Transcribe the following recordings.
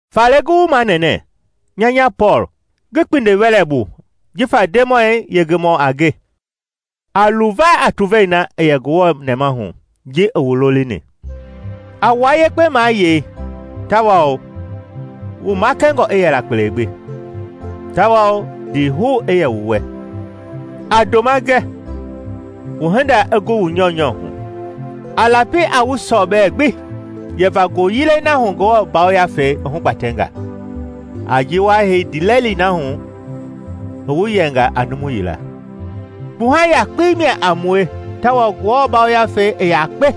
Faale ngi wu manɛnɛ, nya nya Pɔɔl, ngi kpindiwɛlɛ bu jifa Ndemɔi yengemɔ a nge, a luva a tuvei na i yɛ Ngewɔ nɛmahu jii wu lolini. A wua yekpe mayei tawao, wu makɛngɔ i yɛla kpele gbi, tawao ndiihou i yɛ wu wɛ. A ndoma gɛ wu hinda i gu wu nyɔunyɔ hu. A lapi a wu sɔbɛ gbi yɛva ngoyilɛi na hu Ngewɔ Yafei i hugbatɛnga, a ji wa hei ndiilɛli na hu i wu yɛnga a numu yila. Kpuha yakpei mia a mue tawao Ngewɔ Yafei i yakpe,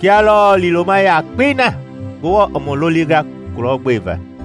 kia lɔɔ liiloma yakpei na Ngewɔ i mu lolinga kulɔgbeva.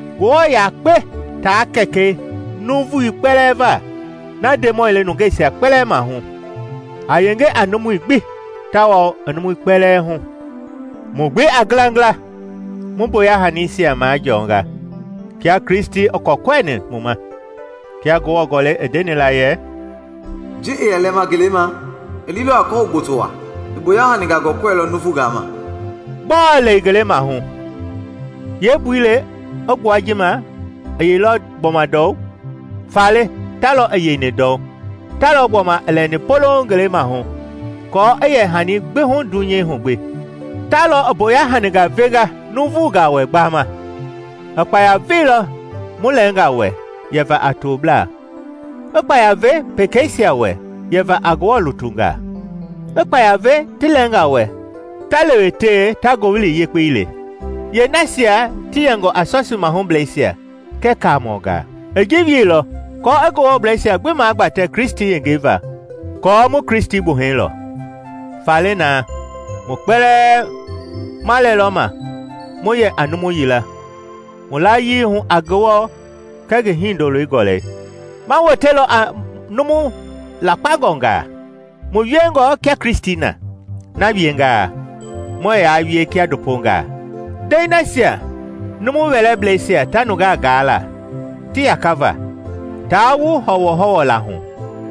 Ngewɔ yakpe taa Kɛkɛi nuuvu kpɛlɛɛ va, na Ndemɔi le nungeisia kpɛlɛɛ mahu, a yenge a numui gbi tawao, i numui kpɛlɛɛ hu. Mu gbi a ngilangila, mu mboya hanisia majɔɔnga kia Kristi i kɔɛkɔɛini mu ma. Kia Ngewɔ Gɔlɛi i ndeni la yɛ, “Ji i yɛ lɛma ngeleima, i liilɔ a kɔhou gboto waa; i mboya haningaa gɔɛkɔɛilɔ nuuvungaa ma.” Gbɔɔ “i lɛilɔ ngelemahu” yeembui le i gbua ji ma i yeilɔ gbɔma ndɔu. Faale ta lɔɔ i yeini ndɔu, talɔ gbɔma i lɛni polouŋ ngelemahu, aako i yɛ hani gbi hu dunyei hu gbi. Ta lɔ i mboya haningaa venga nuuvungaa wɛ gbama; i kpaya veilɔ mu lɛɛnga wɛ yɛva a toblaa, i kpaya ve pekeisia wɛ yɛva a Ngewɔ lutungaa, i kpaya ve ti lɛɛngaa wɛ ta lewetewe ta Ngowili Yekpei le, yeenasia ti yɛngɔ a sɔsii mahublɛisia kɛɛ kaamɔngaa. I ji wieilɔ aako i Ngewɔbleisia gbi magbatɛ Kristi yengei va kɔɔ mu Kristi gbuhɛi lo. Faale na, mu kpɛlɛɛ ma lɛlɔ ma mu yɛ a numu yila mu layii hu a Ngewɔ kɛɛ ngi Hindoloi gɔlɛi; ma wotelɔ a numu lakpangɔngaa, mu wiengɔ kia Kristi na. Na wiengaa muɛɛ yaa wie kia ndopongaa, ndɛi nasia numu wɛlɛbleisia ta nungaa gaa la ti yakava, taa wu hɔwɔhɔwɔ la hu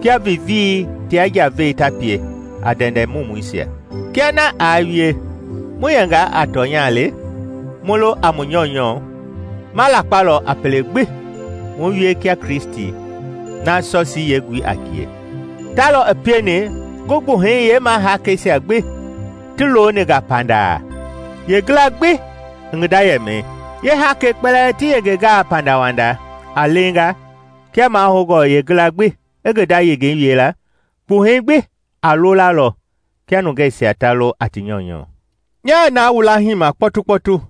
kia viivii tia njavei ta pie a ndɛndɛ mumuisia. Kia na aa wie, mu yɛngaa a tɔnya le, mu lo a mu nyɔunyɔ, ma lakpalɔ a pele gbi mu wie kia Kristi, na sɔsii yeengui a ngie. Ta lɔ i pieni ngi gbuhɛi yeemahakɛisia gbi ti looni nga pandaa, yeengila i ngi nda yɛmɛi. Yeehakɛi kpɛlɛɛ ti yengengaa pandawanda a leenga kia mahoungɔ yeengila gbi i ngi nda yengei wie la, kpuhɛi gbi a loolalɔ kia nungeisia ta lo a ti nyɔunyɔ. Nyaa naa wu laahima kpɔtukpɔtu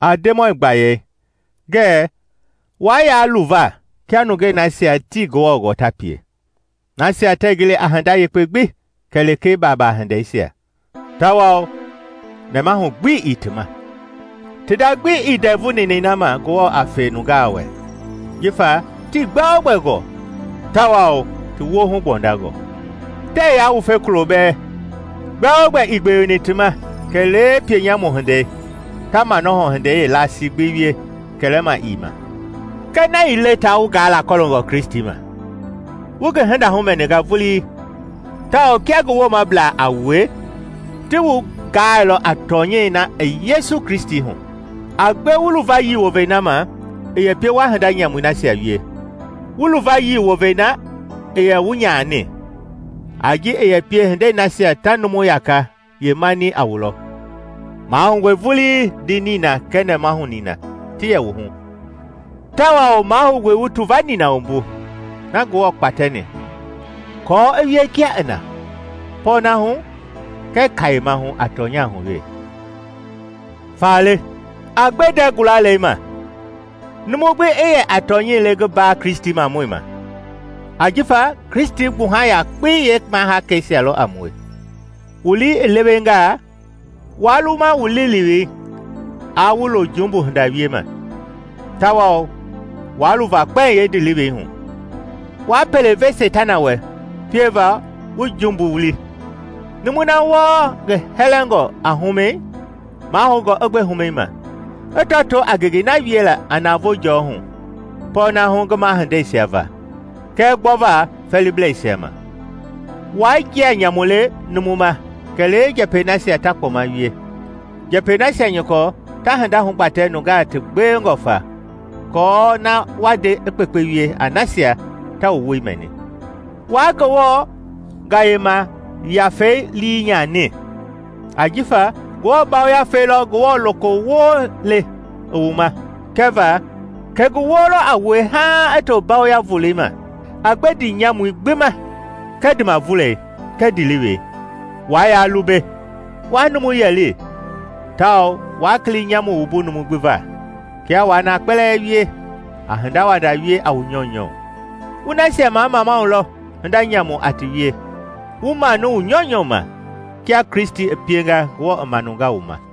a Ndemɔi gbayei ngɛɛ waa yaa luva kia nungei nasia tii Ngewɔ gɔɔ ta pie, nasia tɛɛ gili a hinda yekpe gbi kɛlee baabaa hindeisia, tawao nɛmahu gbi ii ti ma. Ti nda gbi ii ndɛvu ninɛi na ma Ngewɔ a fe nungaa wɛ jifa tii gbɛogbɛ gɔɔ tawao ti woohu gbɔndangɔ. Tɛɛ yaa wufe kulo bɛɛ; gbɛogbɛ ii gbeweni ti ma kɛlee pie nyamu hindei, ta manɔhɔ hindei yeelasii gbi wie kɛlɛma ii ma. Kɛɛ na ii le taa wu gaa la kɔloongɔ Kristi ma! Wu ngi hinda humɛninga vulii tawao kia ngi woomablaa a wue, ti wu gaailɔ a tɔnyɛi na i Yesu Kristi hu. A gbe wu luvayii wovei na ma i yɛ pie wa hinda nyamui nasia wie, wu luvayii wovei na i yɛ wu nyani, a ji i yɛ pie hindei nasia ta numu yaka yeemani a wu lɔ. Mahoungɔe vulii ndii nina kɛɛ nɛmahu nina ti yɛ wu hu, tawao mahoungɔe wu tuva nina wumbu na Ngewɔ kpatɛni kɔɔ i wie kia i na, pɔɔnahu kɛɛ kayemahu a tɔnyahu we. Faale a gbe ndɛɛ gulalei ma, numu gbi i yɛ a tɔnyɛi le ngi mbaa Kristimamɔi ma ajifa Kristi gbuha yakpei yeemahaakɛisia lɔ a mue. Wu lii i lewengaa, waa luma wu liilewei aa wu lo jumbu hinda wiema; tawao waa luva kpɛiŋ yeendilewei hu. Waa pele ve Seitana wɛ pieva wu jumbu wuli. Numu na wɔɔ ngi hɛlɛngɔ a humɛi, mahoungɔ i gbe humɛi ma, i tɔtoo a ngengei na wiela a navoo jɔɔ hu pɔɔna hu ngi mahindeisia va kɛɛ gbɔva fɛɛliblɛisia ma. Waa njia nyamu le numu ma kɛlee njɛpɛi nasia ta kpɔma wie, njɛpɛi nasia nyɔkɔ ta hinda hugbatɛ nungaa ti gbewengɔ fa aako na wa nde i kpekpe wie a nasia ta wu woi mɛni. Waa Ngewɔ Gayema Yafei lii nyani; ajifa Ngewɔ Yafei lɔ Ngewɔ lokowoo le i wu ma kɛva kɛ ngi woo lɔ a wue haaŋ i to mbayoya voloi ma. A gbe ndiimanyamui gbi ma kɛɛ ndiimavulɛi kɛɛ ndiilewei. Waa yaa lumbe, waa numu yɛli, tawao waa kili nyamu wumbu numu gbi va. Kia waa na kpɛlɛɛ wie, a hindawanda wie a wu nyɔunyɔ, wu nasia mamamau lɔ hinda nyamu a ti wie, wu manu wu nyɔunyɔ ma, kia Kristi i pienga Ngewɔ i maanunga wu ma.